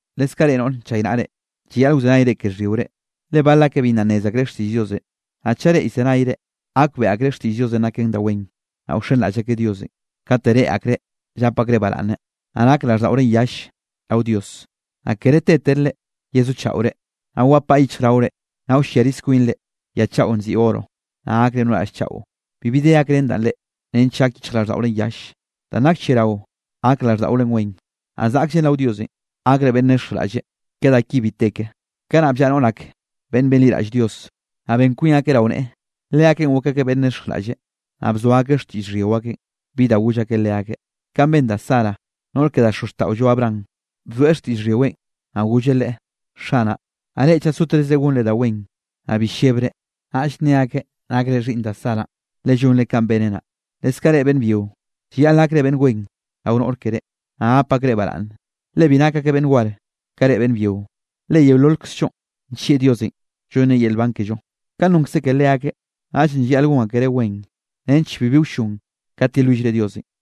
Leskaꞌ reꞌ noꞌre nchaynaꞌre, llayaꞌl wzenayre ke xhyiore, le bal akeꞌ bi nna nnez akreꞌ xtiꞌll Diosenꞌ, naꞌ chaꞌ reꞌ llzenayre, gakbeꞌe akreꞌ xtiꞌll Diosenꞌ naken da wen, naꞌ wxenraꞌll akeꞌ Diosenꞌ, kate reꞌe akreꞌ llap akreꞌ baraꞌnne, naꞌ nak raꞌlldaꞌorenꞌ yall rao Dios. Naꞌ kere tetere yezochaꞌore, naꞌ wapaꞌ yichjraore, naꞌ wlliarize kwinre ya chaꞌo nziꞌi oro, naꞌ gakre no raꞌll chaꞌo. Bibi de gakrén danꞌ reꞌ, nench gak yichjraꞌlldaꞌorenꞌ yall. Danꞌ nak lliarao, gak raꞌlldaꞌore wen. Naꞌ zaꞌkllen rao Dios gakre beꞌnn nexjraꞌlle, ke da ki bi te ke. Kanaꞌ bllaꞌa noꞌr ak beꞌnn benliraꞌll Dios, naꞌ ben kwin akeꞌ rao neꞌe. Leakeꞌn gok akeꞌ beꞌnn nexjraꞌlle, naꞌ bzoa akeꞌ xtiꞌll xhyio akeꞌn, bi da goll akeꞌ leakeꞌ. Kanꞌ ben da Sara, noꞌr ke da xozxtaꞌollo Abraham, bzoeꞌ xtiꞌll xhyiweꞌn, naꞌ golleꞌ leꞌe: “Xanaꞌ”. Naꞌ reꞌ chaꞌ sotezre gonre da wen, naꞌ bi llebre, naꞌll nne akeꞌ nakre xhiꞌnn da Saranꞌ, le llonre kanꞌ beneꞌ naꞌ. Leskaꞌ reꞌ beꞌnn byio, leskaꞌ llayaꞌl gakre beꞌnn wen rao noꞌr keré, naꞌ gap akreꞌ baraꞌnne, le bi nak akeꞌ beꞌnn war ka reꞌ beꞌnn byio. Le yeololkzllonꞌ, nllieꞌ Dios llonneꞌ yel nban kello, kanꞌ nonnkzeꞌ ke leakeꞌ. Naꞌllenꞌ llayaꞌl gon akereꞌ wen nench bibi wllon kat yelwillre Diosenꞌ.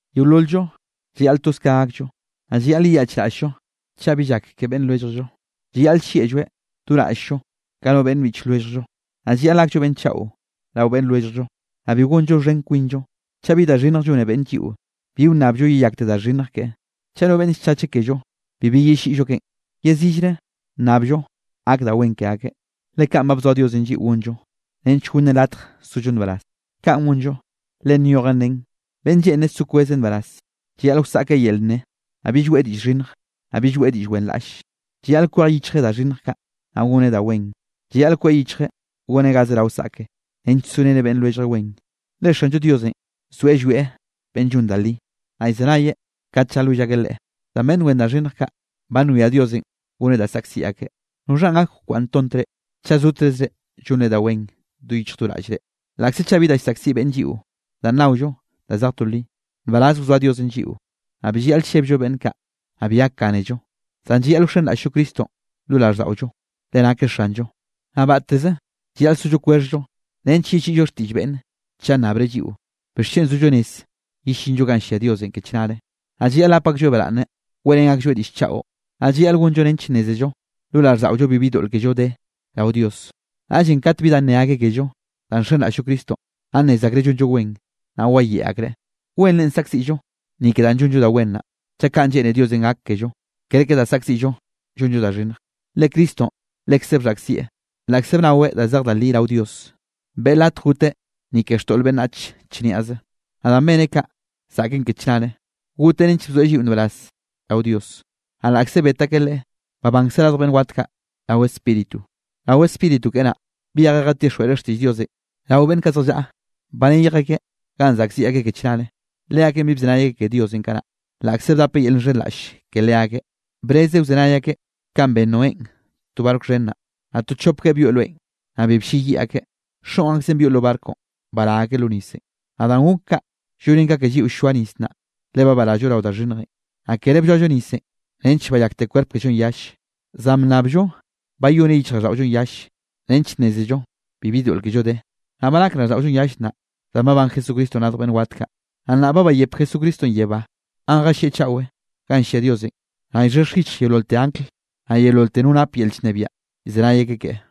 Yeolol-llo llayaꞌl toz ka gakllo, naꞌ llayaꞌl yeyaꞌchraꞌll-llo chaꞌ bi llak ke beꞌnn lwelljllo. Llayaꞌl llieꞌlloeꞌ do raꞌll-llo ka no beꞌnn biꞌch lwelljllo, naꞌ llayaꞌl gakllo beꞌnn chaꞌo rao beꞌnn lwelljllo, naꞌ bi gonllo xhen kwinllo. Chaꞌ bi da xhinnj llone beꞌnne lliꞌo, bi wnnabllo yeyakte da xhinnj keꞌe. Chaꞌ no beꞌnn llchacheꞌ kello, bibi yelliꞌllo keꞌen, yezillre nnabllo gak da wen ke akeꞌ, le kaꞌn ba bzoa Diosenꞌ lliꞌo gonllo, nench gonnen latj sollo nbaraz. Kaꞌn gonllo, le nyojen nen: Beꞌnn lleꞌne so kweze nbaraz, llayaꞌl wsaꞌkeꞌ yel nne, naꞌ bill weꞌe diꞌll xhinnj, naꞌ bill weꞌe diꞌll wenraꞌlle. Llayaꞌl kwej yichjeꞌ da xhinnj kaꞌ, naꞌ goneꞌ da wen. Llayaꞌl kweꞌ yichjeꞌ goneꞌ ga zerao saꞌkeꞌ, nench sorén beꞌnn lwelljeꞌ wen. Le Xanllo Diosenꞌ zoeꞌ llwieꞌ beꞌnn llon da li, naꞌ llzenayeꞌ kat llalwill akeꞌ Leꞌe. Zan beꞌnn wen da xhinnj kaꞌ, ba nwia Diosenꞌ goneꞌ da saꞌkziꞌ akeꞌ. ¿Noxha gak wkwaꞌnntont reꞌ, chaꞌ zotezre llonre da wen do yichj do raꞌllre? Laꞌkze chaꞌ bi da llsaꞌkziꞌ beꞌnne lliꞌo, danꞌ naollo da zej to li, nbaraz wzoa Diosenꞌ lliꞌo. Naꞌ bi llayaꞌl llebllo beꞌnn kaꞌ, naꞌ bi gakgánello. Zan llayaꞌl wxenraꞌll-llo Cristonꞌ lo raꞌlldaꞌollo, le nakeꞌ Xanllo. Naꞌ batteze llayaꞌl sollo kwexhllo nench yelliꞌllo xtiꞌll beꞌnne chaꞌ nnabreꞌ lliꞌo, bixchen zollo rez yellinllo ganꞌ llia Diosenꞌ ke chnare. Naꞌ llayaꞌl gap aklloeꞌ baraꞌnne, weꞌrén aklloeꞌ diꞌll chaꞌo. Naꞌ llayaꞌl gonllo nench nnézello lo raꞌlldaꞌollo bibi doꞌl kello de rao Dios, naꞌllenꞌ kat bi da nne akeꞌ kello danꞌ nxenraꞌll-llo Cristonꞌ, naꞌ nnez akreꞌ llonllo wen, naꞌ wayeꞌe akreꞌ. Wenre saꞌkziꞌllo ni ke danꞌ llonllo da wen naꞌ, chaꞌ kaꞌn lleꞌne Diosenꞌ gak kello, kerke da saꞌkziꞌllo llonllo da xhinnj. Le Cristonꞌ lekze bxhaꞌkzieꞌ. Laꞌkze bnaweꞌ da zej da li rao Dios, beꞌe latj goteꞌ ni ke xtoꞌl beꞌnnach chniaze, naꞌ danꞌ beneꞌ kaꞌ zaꞌken ke chnare. Goteꞌ nench bzoeꞌ lliꞌo nbaraz rao Dios. Naꞌ laꞌkze bet akeꞌ Leꞌe, babankzeꞌ radj beꞌnn wat kaꞌ rao Spíritu. Rao Spíritu keꞌe naꞌ, byejeꞌ jatixjweꞌreꞌ xtiꞌll Diosenꞌ rao beꞌnn kaꞌ zjallaꞌa ba neyj akeꞌ ganꞌ saꞌkziꞌ akeꞌ ke chnare. Leakeꞌn bi bzenay akeꞌ ke Diosenꞌ kanaꞌ, laꞌkze bdapeꞌ yel llxhenraꞌlle ke leakeꞌ, brezeꞌ wzenay akeꞌ kanꞌ ben Noénꞌ to barco xhen naꞌ. Naꞌ to chopgueꞌ byoꞌ loenꞌ, naꞌ bi blleyiꞌ akeꞌ, xoꞌn akzeꞌ byoꞌ lo barconꞌ bará akeꞌ lo nisenꞌ. Naꞌ danꞌ gok kaꞌ llonen ka ke lliꞌo ll-lloa nis nnaꞌ, le ba barallo rao da xhinnjenꞌ. Naꞌ kere blloallo nisenꞌ nench bayakte kwerp kellonꞌ yalle, zan bnnabllo bayoneꞌ yichjraꞌlldaꞌollonꞌ yalle, nench nnézello bibi doꞌl kello de. Naꞌ ba nak raꞌlldaꞌollonꞌ yalle nnaꞌ, danꞌ babán Jesucristonꞌ radj beꞌnn wat kaꞌ. Naꞌ nnaꞌ ba bayep Jesucristonꞌ yebá ganꞌ jallieꞌ chaꞌwe ganꞌ llia Diosenꞌ, naꞌ llxhexj yichj yeololte angl, naꞌ yeololte no nap yel llnebiaꞌ llzenay akeꞌ keꞌe.